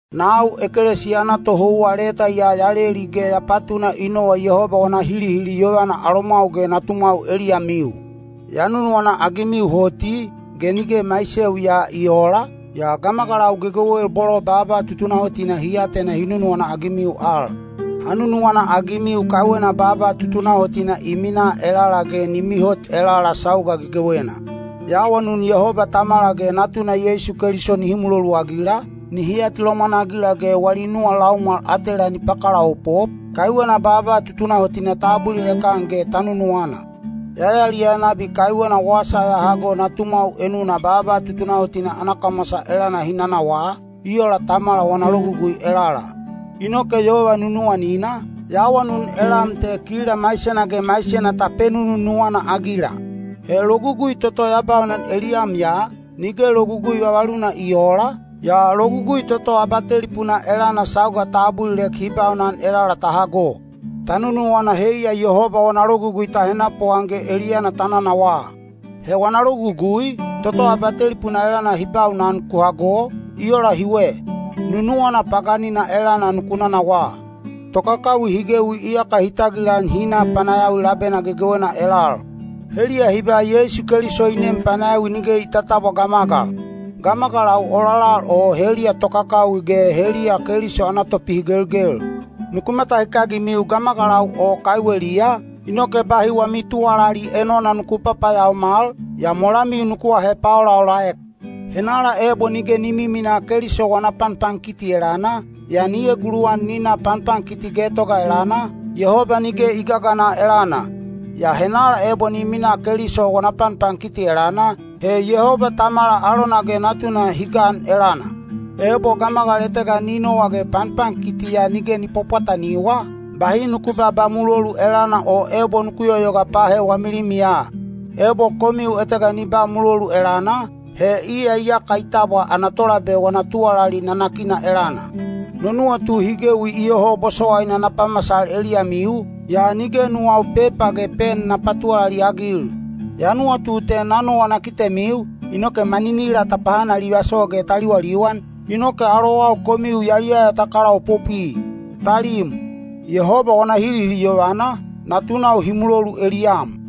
Nau ekelesiya ana tohouwa leta ya ya leli ge ya patuna i nowa Yehoba wana hilihili yovana alomwau ge natumwau eliyamiu. Ya nunuwana-agimiu hoti, ge nige maiseu ya i oola, yaa gamagalau gegewel bolo baaba tutunahotina hi atena hi nunuwana-agimiu al. Ha nunuwana-agimiu kaiwena baaba tutunahotina i minaa elala ge ni mihot elala sauga gegewena. Ya awanun Yehoba Tamala ge Natuna Yeisu Keliso nihi muloluagila, nihi atilomwan-agila ge wali nuwa laumwal atela ni pakalaopop, kaiwena baaba tutunahotina ta abulilek-an ge ta nununuwana. Ya yaliyaya nabi kaiwena wasa ya hago natumwau enuna baaba tutunahotina ana kamwasa elana hi nanawaa, i ola Tamala wana logugui elala. Inoke yova nunuwanina, ya awanun elam te kila maisena ge maisena ta penununuwana-agila. He logugui toto ya baunan eliyam ya, nige logugui vavaluna i oola, yaa logugui toto abatelipuna elana sauga ta abulilek hi baunan elala ta hago. Ta nunuwana heiya Yehoba wana logugui ta henapuan ge eliyana ta nanawaa. He wana logugui, toto abatelipuna elana hi baunan ku hago, i ola hiwe: nunuwana paganina elana nuku nanawaa. Tokakawi hi gewi iyaka hi tagilan hi na panayawi labena gegewena elal. Heliya hi ba Yeisu Keliso i nem panayawi nige i tatabwa gamagal. Gamagalau ololal o heliya tokakawi ge heliya Keliso ana topihigelgel. Nuku matahikagimiu gamagalau o kaiweliya, inoke bahi wami tuwalali enona nuku papayaomal, yaa molamiu nuku ahe paolaolaek. Henala ebo nige ni miminaa Keliso wana panpankiti elana, yaa ni eguluwan ni na panpankiti getoga elana, Yehoba nige i gagana elana. Yaa henala ebo ni minaa Keliso wana panpankiti elana, he Yehoba Tamala alona ge Natuna hi gan elana. Ebo gamagal etega ni nowa ge panpankiti ya nige ni pwapwataniwa, bahi nuku babaa mulolu elana o ebo nuku yoyoga pahe wami limiya. Ebo komiu etega ni ba mulolu elana, he iya iyaka i tabwa ana tolabe wana tuwalali nanakina elana. No nuwatu hi gewi iyoho bosowaina na pamasal eliyamiu, yaa nige nuwau pepa ge pen na patuwalali-agil. Ya nuwatu te na nowa na kitemiu, inoke maninila ta pahanalivaso ge ta liwaliwan, inoke alowau komiu yaliyaya ta kalaopopwi. Talim, Yehoba wana hilihili yovana, natunau hi mulolu eliyam.